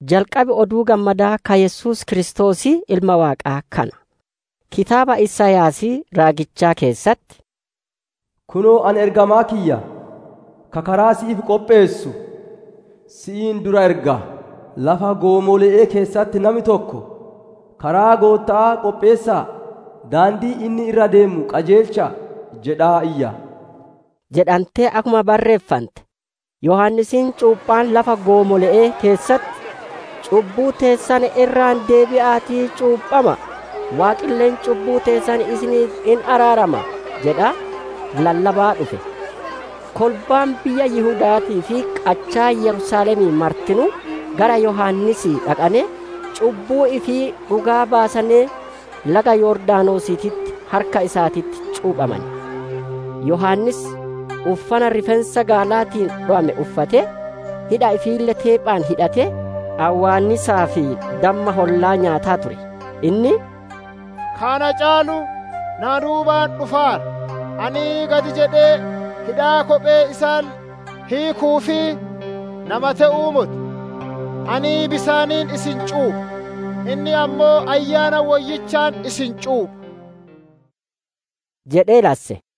Jalqabi Oduu Gammadaa ka Yesuus Kiristoosii Ilma Waaqaa kana. Kitaaba Isaayaasii raagichaa keessatti, «Kunoo, Ani ergamaa kiyya ka karaa si'iif qopheessu si'iin dura erga. Lafa goomole'ee keessatti nami tokko, ‹Karaa Gootta'aa qopheessa'a; daandii inni irra ideemu qajeelcha'a!› jedhaa iyya» jedhantee akkuma barreeffante. Yohaannisiin cuuphaan lafa goomole'ee keessatti, «Cubbuu teessan irraa deebi'aatii, cuuphama'a! Waaqille cubbuu teessan isiniif hin araarama» jedhaa lallabaa dhufe. Kolbaan biyya Yihuda'aatii fi qachaa Yerusaalemii martinuu gara Yohaannisii dhaqanee, cubbuu ifii dhugaa baasanee, laga Yordaanosiititti harka isaatitti cuuphamane. Yohaannis uffana rifeensa gaalaatiin dhowame uffatee, hidha ifiille teephaan hidhatee, awwaannisaa fi damma hollaa nyaataa ture. Inni, «Ka na caalu na duubaan dhufaara; ani gad jedhee hidhaa kophee isaalle hiiku'uuf nama te'uu moti. Ani bisaaniin isin cuupha; inni ammoo Ayyaana Woyyichaan isin cuupha» jedhee lasse.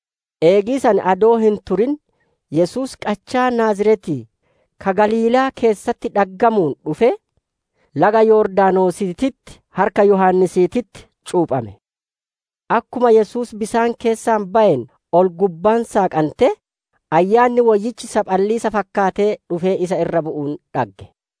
Eegi san adoo hin turin Yesuus, qachaa Naaziretii ka Galiilaa keessatti dhaggamuu dhufee, laga Yordaanosiititti harka Yohaannisiititti cuuphame. Akkuma Yesuus bisaan keessaa bayeen, ol-gubbaan saaqantee, Ayyaanni Woyyichi saphaliisa fakkaatee dhufee isa irra bu'uun dhagge.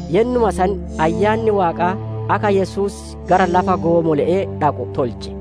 Yennuma san Ayyaanni Waaqaa akka Yesuus gara lafa goomole'ee dhaqu tolche.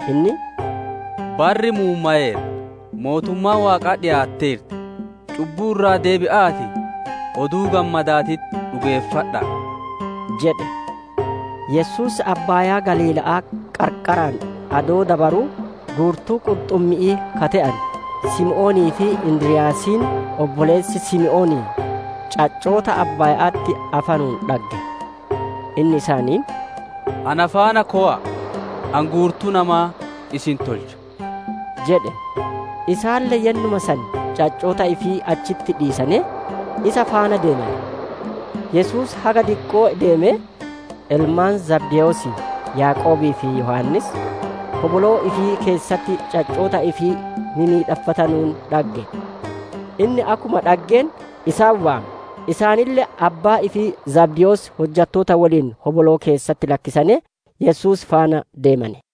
Inni, «Barri muummaweera, mootummaan waaqaa dhikaatteerti, cubbuu irraa deebi'aatii Oduu Gammadaatitti dhugeeffadha'a!» jedhe. Yesuus Abbaayaa Galiila'aa qarqaraan adoo dabaruu, guurtuu qurxummi'ii ka te'ane Simoonii fi Indiryaasiin obboleessi Simoonii caccoo tiyyoo Abbaaya'atti afanuun dhagge. Inni isaaniin, «Ana faana kowa'a! Ani guurtuu namaa isin tolcha» jedhe. Isaanille yennuma san caccoota ifii achitti dhiisanee, isa faana deemane. Yesuus haga diqqoo ideemee, ilmaan Zabdewoosii Yaaqoobii fi Yohaannis, hoboloo ifii keessatti caccoota ifii mimmidhaffatanuun dhagge. Inni akkuma dhaggeen isaan waame; isaanille abbaa ifii Zabdewoos hojjattoota woliin hoboloo keessatti lakkisanee Yesuus faana deemane.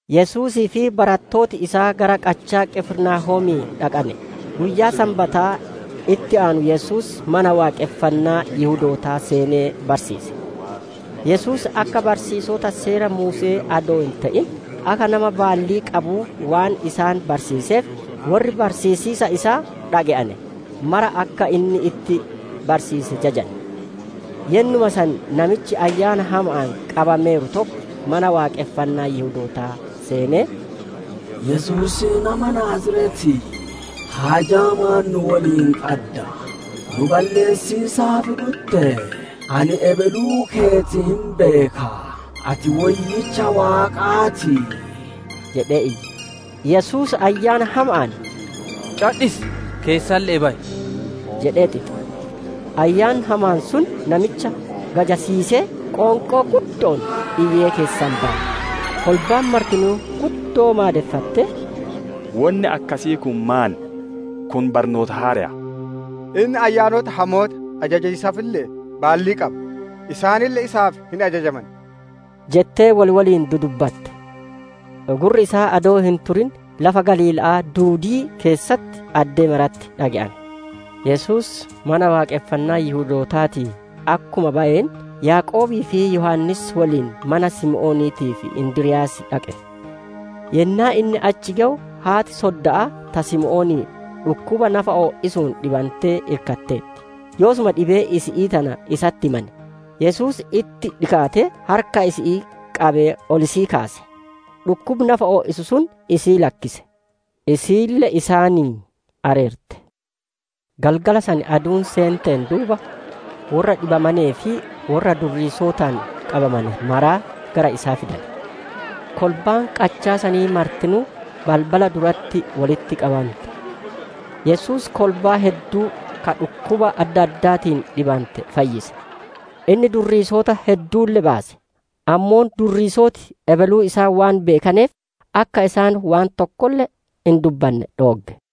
Yesuusii fi barattooti isaa gara qachaa Qifirnaahoomii dhaqane; guyyaa Sanbata itti aanuu Yesuus Mana Waaqonfannaa Yihudootaa seenee barsiise. Yesuus akka barsiisota Seera Muuse'ee adoo hin te'in, akka nama baallii qabuu waan isaan barsiiseef worri barsiisiisa isaa dhage'ane maraa akka inni itti barsiise jajane. Yennuma san namichi ayyaana hama'aan qabameeru tokko Mana Waaqonfannaa Yihudootaa seenee, «Yesuusii nama Naaziretii, haajaa maan nu woliin qadda? Nu balleessiisaaf dhuttee? Ani ebeluu teeti hin beeka; ati Woyyicha Waaqaa ti!» jedhe iyye. Yesuus ayyaana hama'aan «Cadhisi! Keessalle'ee bayi» jedhee xixe. Ayyaanni hamaan sun namicha gajassiisee, qoonqoo guddo'oon iyyee keessaa baye. Kolbaan martinuu guddoo maadeffattee, «Wonni akkasii kun maan? Kun barnoota haareya! Inni ayyaanota hamoota ajajiisaafille baallii qaba; isaanille isaaf hin ajajaman» jettee wol woliin dudubbatte. Gurri isaa adoo hin turin lafa Galiila'aa duudii keessatti addee maratti dhage'ame. Yesuus Mana Waaqonfannaa Yihudootaatii akkuma bayeen, Yaaqoobii fi Yohaannis woliin mana Simooniitii fi Indiryaasii dhaqe. Yennaa inni achi gewu haat-sodda'aa ta Simoonii dhukkuba nafa o'isuun dhibantee irkatteerti; yoosuma dhibee isi'ii tana isatti himane. Yesuus itti dhikaatee, harka isi'ii qabee ol isii kaase; dhukkubi nafa o'isu sun isii lakkise; isiille isaanii areerte. Galgala san aduun seenteen duuba, worra dhibamanee fi worra durriisotaan qabamane maraa gara isaa fidane. Kolbaan qachaa sanii martinuu balbala duratti wolitti qabante. Yesuus kolbaa hedduu ka dhukkuba adda addaatiin dhibante fayyise. Inni durriisota hedduulle baase; ammoo durriisoti ebeluu isaa waan beekaneef, akka isaan waan tokkolle hin dubbanne dhoogge.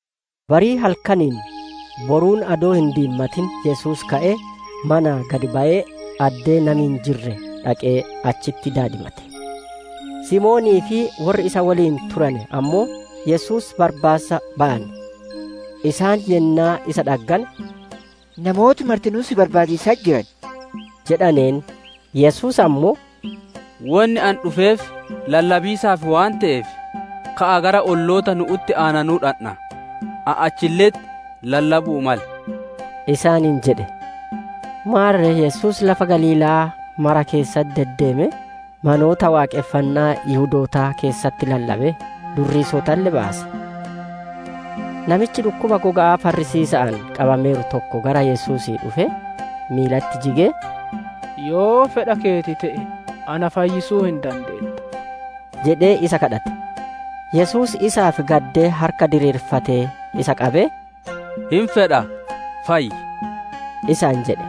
Barii halkaniin, boruun adoo hin diimatin Yesuus ka'ee, manaa gad bayee addee nami hin jirre dhaqee, achitti daadimate. Simoonii fi worri isa woliin turane ammoo Yesuus barbaassa bayane. Isaan yennaa isa dhaggane, «Namooti martinuu si barbaadiisatti jiran» jedhaneen. Yesuus ammoo, «Wonni Ani dhufeef lallabiisaaf waan te'eef, ka'aa gara olloota nu'utti aananuu dhandha, ani achille'etti lallabu'uu male» isaaniin jedhe. Maarre, Yesuus lafa Galiila'aa maraa keessa deddeemee, manoota waaqonfannaa Yihudootaa keessatti lallabee, durriisotalle baase. Namichi dhukkuba goga'aa farrisiisa'aan qabameeru tokko gara Yesuusii dhufee, miilatti jigee, «Yoo fedha keeti te'e na fayyisuu hin dandeetta» jedhee isa gaafate. Yesuus isaaf gaddee harka diriirfatee isa qabee, «Hin fedha, fayyi!» isaan jedhe.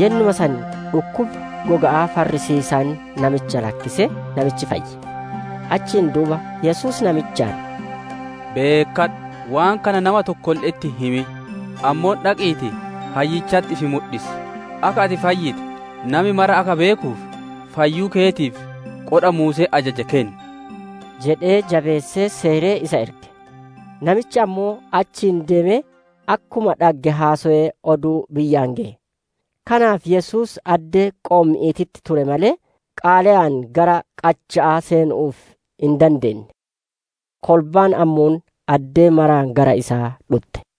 Yennuma san dhukkubi goga'aa farrisiisaan namicha lakkisee, namichi fayye. Achiin duuba Yesuus namichaan, «Beekkadhu! Waan kana nama tokkolle'etti hin himin; ammoo dhaqiitii hayyichatti ifi mudhisi; akka ati fayyite, nami mara akka beekuuf, fayyuu keetiif, qodha Muuseen ajaje kenni!» jedhee, jabeessee, seeree, isa erge. Namichi ammoo achii deemee, akkuma dhagge haasowee oduu biyyaan geye. Kanaaf Yesuus addee qoommi'iititti ture malee, qaaleyaan gara qacha'aa seenu'uuf hin dandeenne. Kolbaan ammoo addee maraa gara isaa dhutte.